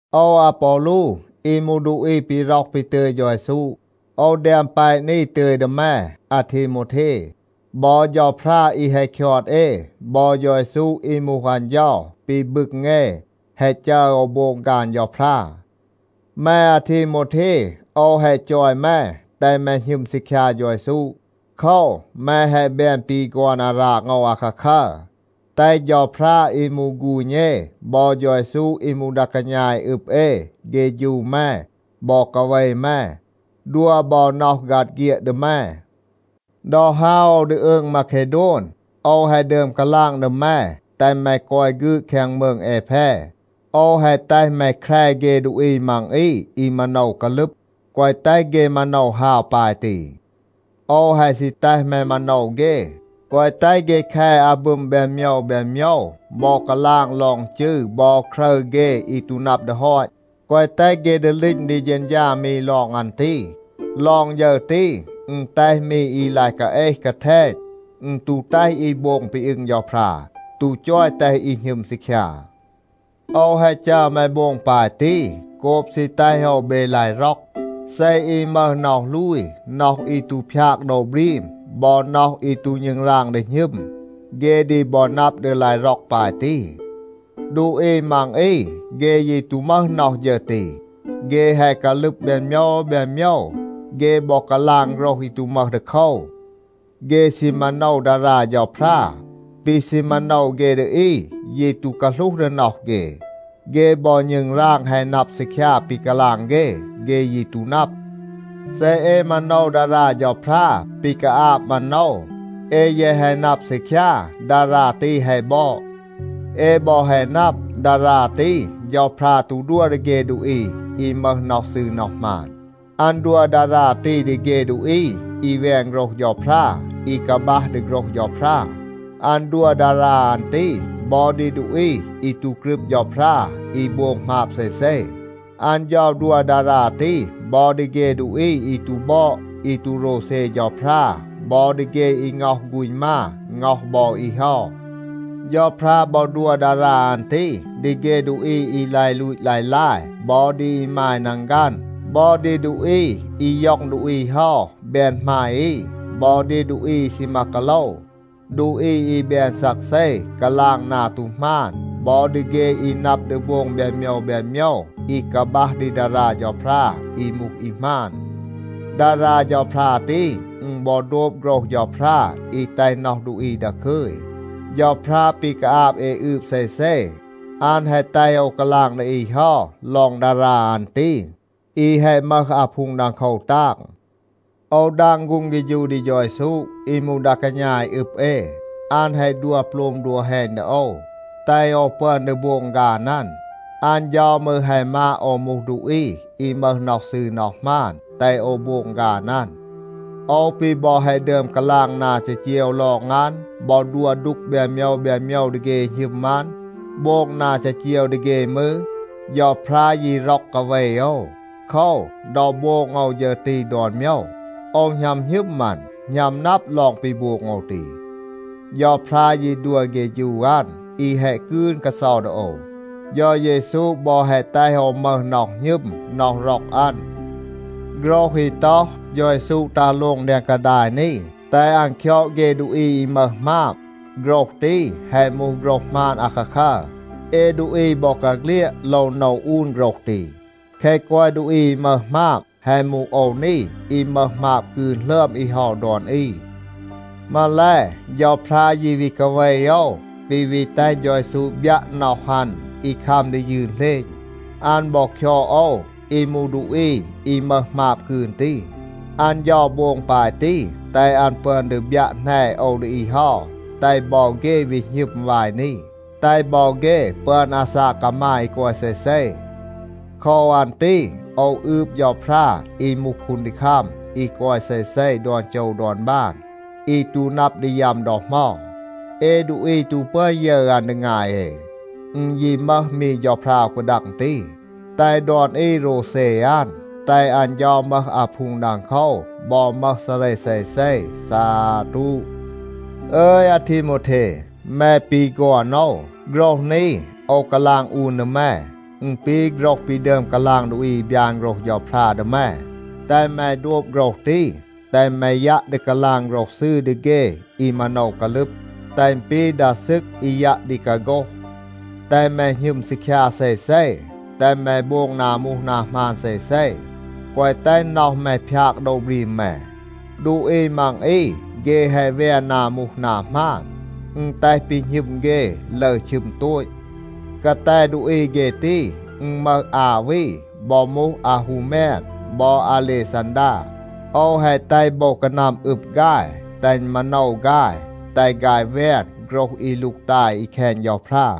โอว อาปอลู อี มูห ดูอี ปี ร็อห ปี ตึย เฌา เยซู, โอว แดม แปะ นี ตึย ดี แม อาทีโมวเท. บอ เฌาพรา อี แฮะ คยอด เอ, บอ เฌา เยซู อี มูห อัน เฌา ปี บึง เอ แฮะ จัร โอว โบง ฆาน เฌาพรา. แม อาทีโมวเท, โอว แฮะ จอย แม, แตห แม หณึม ซีคยา เฌา เยซู. โคว, แม แฮะ แบน ปี ฆอน อาราง โอว อาคาคัร. แตห เฌาพรา อี มูห ฆูณ เอ บอ เฌา เยซู อี มูห ดา กาณา อี อึบ เอ เฆฌู แม บอ กาเว แม, ดัว บอ น็อห ฆัด เฆียด ดี แม. ดอ ฮาว โอว ดี อืง มาเคโดน, โอว แฮะ ดึอม กาลาง ดี แม, แตห แม กอย ฆืด แคง มืง แอแพ. โอว แฮะ แตห แม แคร เฆ ดูอี มัง อี อี มาโนว กาลึบ, แกวะ แตห เฆ มาโนว ฮาว ปาย ตี. โอว แฮะ ซี แตห แม มาโนว เฆ, แกวะ แตห เฆ แค อาบึม แบน โมยว แบน โมยว บอ กาลาง ลอง จืร บอ ครึร เฆ อี ตู นับ ดี ฮอต. แกวะ แตห เฆ ดีลีณ ดี เฌณฌา มี ลอง อัน ตี. ลอง ฌึร ตี, อึณ แตห มี อี ลาย กาเอห, กาแทณ. อึณ ตู แตห อี โบง ปี อึง เฌาพรา, ตู จอย แตห อี หณึม ซีคยา. โอว แฮะ จัร แม โบง ปาย ตี, โกบ ซี แตห โอว เบ ลาย ร็อก. เซ อี มึห น็อห ลูย, น็อห อี ตู พยาก โดว บรีม, บอ น็อห อี ตู ณึงราง ดี หณึม, เฆ ดี บอ นับ ดี ลาย ร็อก ปาย ตี. ดูอี มัง อี, เฆ ยี ตู มึห น็อห ฌึร ตี. เฆ แฮะ กาลึบ แบน โมยว แบน โมยว. เฆ บอ กาลาง โฆรห อี ตู มึห ดีโคว. เฆ ซี มาโนว ดารา เฌาพรา. ปี ซี มาโนว เฆ ดี อี ยี ตู กาหลูห ดี น็อห เฆ. เฆ บอ ณึงราง แฮะ นับ ซีคยา ปี กาลาง เฆ, เฆ ยี ตู นับ. เซ เอ มาโนว ดารา เฌาพรา ปี กาอาบ มาโนว, เอ แยะ แฮะ นับ ซีคยา, ดารา ตี แฮะ บอด. เอ บอ แฮะ นับ, ดารา ตี เฌาพรา ตู ดัว ดี เฆ ดูอี อี มึห น็อห ซืร น็อห หมาน. อัน ดัว ดารา ตี ดี เฆ ดูอี อี แวน โฆรห เฌาพรา, อี กาบัห ดี โฆรห เฌาพรา. อัน ดัว ดารา อัน ตี บอ ดี ดูอี อี ตู กรึบ เฌาพรา, อี โบง หมาบ เซเซ. อัน เฌา ดัว ดารา ตี บอ ดี เฆ ดูอี อี ตู บอด อี ตู โรวเซ เฌาพรา บอ ดี เฆ อี ง็อห ฆูณ มา, ง็อห บอ อี เฮา. เฌาพรา บอ ดัว ดารา อัน ตี ดี เฆ ดูอี อี ลาย ลูต ลาย ลาย บอ ดี อีมาย นังฆัน, บอ ดี ดูอี อี ย็อง ดูอี เฮา แบน หมาย อี บอ ดี ดูอี อี ซีมา กาโลว, ดูอี อี แบน ซักเซ, กาลาง นา ตู หมาน บอ ดี เฆ อี นับ ดี โบง แบน โมยว แบน โมยว อี กาบัห ดี ดารา เฌาพรา อี มูห อี หมาน. ดารา เฌาพรา ตี, อึณ บอ โดบ โฆรห เฌาพรา อี แตห น็อห ดูอี ดาคึย. เฌาพรา ปี กาอาบ เอ อืบ เซเซ, อัน แฮะ แตห โอว กาลาง ดี อี เฮา ลอง ดารา อัน ตี, อี แฮะ มึห อาพูง ดังโคว ตาง. โอว ดาง ฆูง เฆฌู ดี เฌา เยซู อี มูห ดา กาณา อี อึบ เอ. อัน แฮะ ดัว โปลม ดัว แฮณ ดี โอว, แตห โอว ปึอน ดี โบง ฆาน อัน. อัน เฌา มืร แฮะ มาด โอว มูห ดูอี อี มึห น็อห ซืร น็อห หมาน, แตห โอว โบง ฆาน อัน. โอว ปี บอ แฮะ ดึอม กาลาง นา จีจีว ลอง อัน บอ ดัว ดูก แบน โมยว แบน โมยว ดี เฆ อี หณึม อัน, โบง นา จีจีว ดี เฆ มืร, เฌาพรา ยี ร็อก กาเว โอว. โคว, ดอ โบง โอว ฌึร ตี ดอน โมยว, โอว หณัม หณึม อัน, หณัม นับ ลอง ปี โบง โอว ตี. เฌาพรา ยี ดัว เฆฌู อัน อี แฮะ กืน กาเซา ดี โอว. เฌา เยซู บอ แฮะ แตห โอว มึห น็อห หณึม, น็อห ร็อก อัน. โฆรห อี ต็อห, “เฌา เยซู ตัห โลง แดง กาดาย นี, แตห อัน คยอด เฆ ดูอี อี มึห หมาบ,” โฆรห ตี, แฮะ มูห โฆรห หมาน อาคาคัร. เอ ดูอี บอกาเฆลียด โลว โนว อูน โฆรห ตี. แคะ กอย ดูอี อี มึห หมาบ, แฮะ มูห โอว นี อี มึห หมาบ กืน หลึอม อี เฮา ดอน อี. มาแล, เฌาพรา ยี วี กาเว โอว, ปี วี แตห เฌา เยซู บยัะ น็อห อัน อี คัม ดี ยืน เหลณ. อัน บอ คยอด โอว อี มูห ดูอี อี มึห หมาบ กืน ตี. อัน เฌา โบง ปาย ตี, แตห อัน ปึอน ดี บยัะ แหน โอว ดี อี เฮา, แตห บอ เฆ วี หณึม วาย นี, แตห บอ เฆ ปึอน อาซาก กามาย อี กอย เซเซ. โคว อัน ตี โอว อืบ เฌาพรา อี มูห คูนดีคัม อี กอย เซเซ ดอน โจว ดอน บาน, อี ตู นับ ดี ยัม ดอ เหมา. เอ ดูอี ตู ปึอน ยึร อัน ดี งาย เอ. อึณ ยี มึห มี เฌาพรา อู กาดัง ตี. แตห ดอน อี โรวเซ อัน. แตห อัน เฌา มึห อาพูง ดังโคว บอ มึห ซาเร เซเซ. ซาตู. อึย อาทีโมวเท, แม ปี ฆอน โอว, โฆรห นี โอว กาลาง อูน ดี แม. อึณ ปี โฆรห ปี ดึอม กาลาง ดูอี อี บยาน โฆรห เฌาพรา ดี แม. แตห แม โดบ โฆรห ตี. แตห แม ยัะ ดี กาลาง โฆรห ซืร ดี เฆ อี มาโนว กาลึบ, แตห อึณ ปี ดา ซึก อี ยัะ ดี กาโฆห. แตห แม หณึม ซีคยา เซเซ, แตห แม โบง นา มูห นา หมาน เซเซ, แกวะ แตห น็อห แม พยาก โดว บรีม แม. ดูอี มัง อี เฆ แฮะ แวน นา มูห นา หมาน. อึณ แตห ปี หณึม เฆ ลึร ชึม โตต. กาแต ดูอี เฆ ตี, อึณ มึห อา วี บอ มูห อาฮูแมน บอ อาเลซันดา. โอว แฮะ แตห โบว กานัม อึบ ฆาย, แตห อึณ มาโนว ฆาย, แตห ฆาย แวน โฆรห อี ลูกตาย อี แคณ เฌาพรา.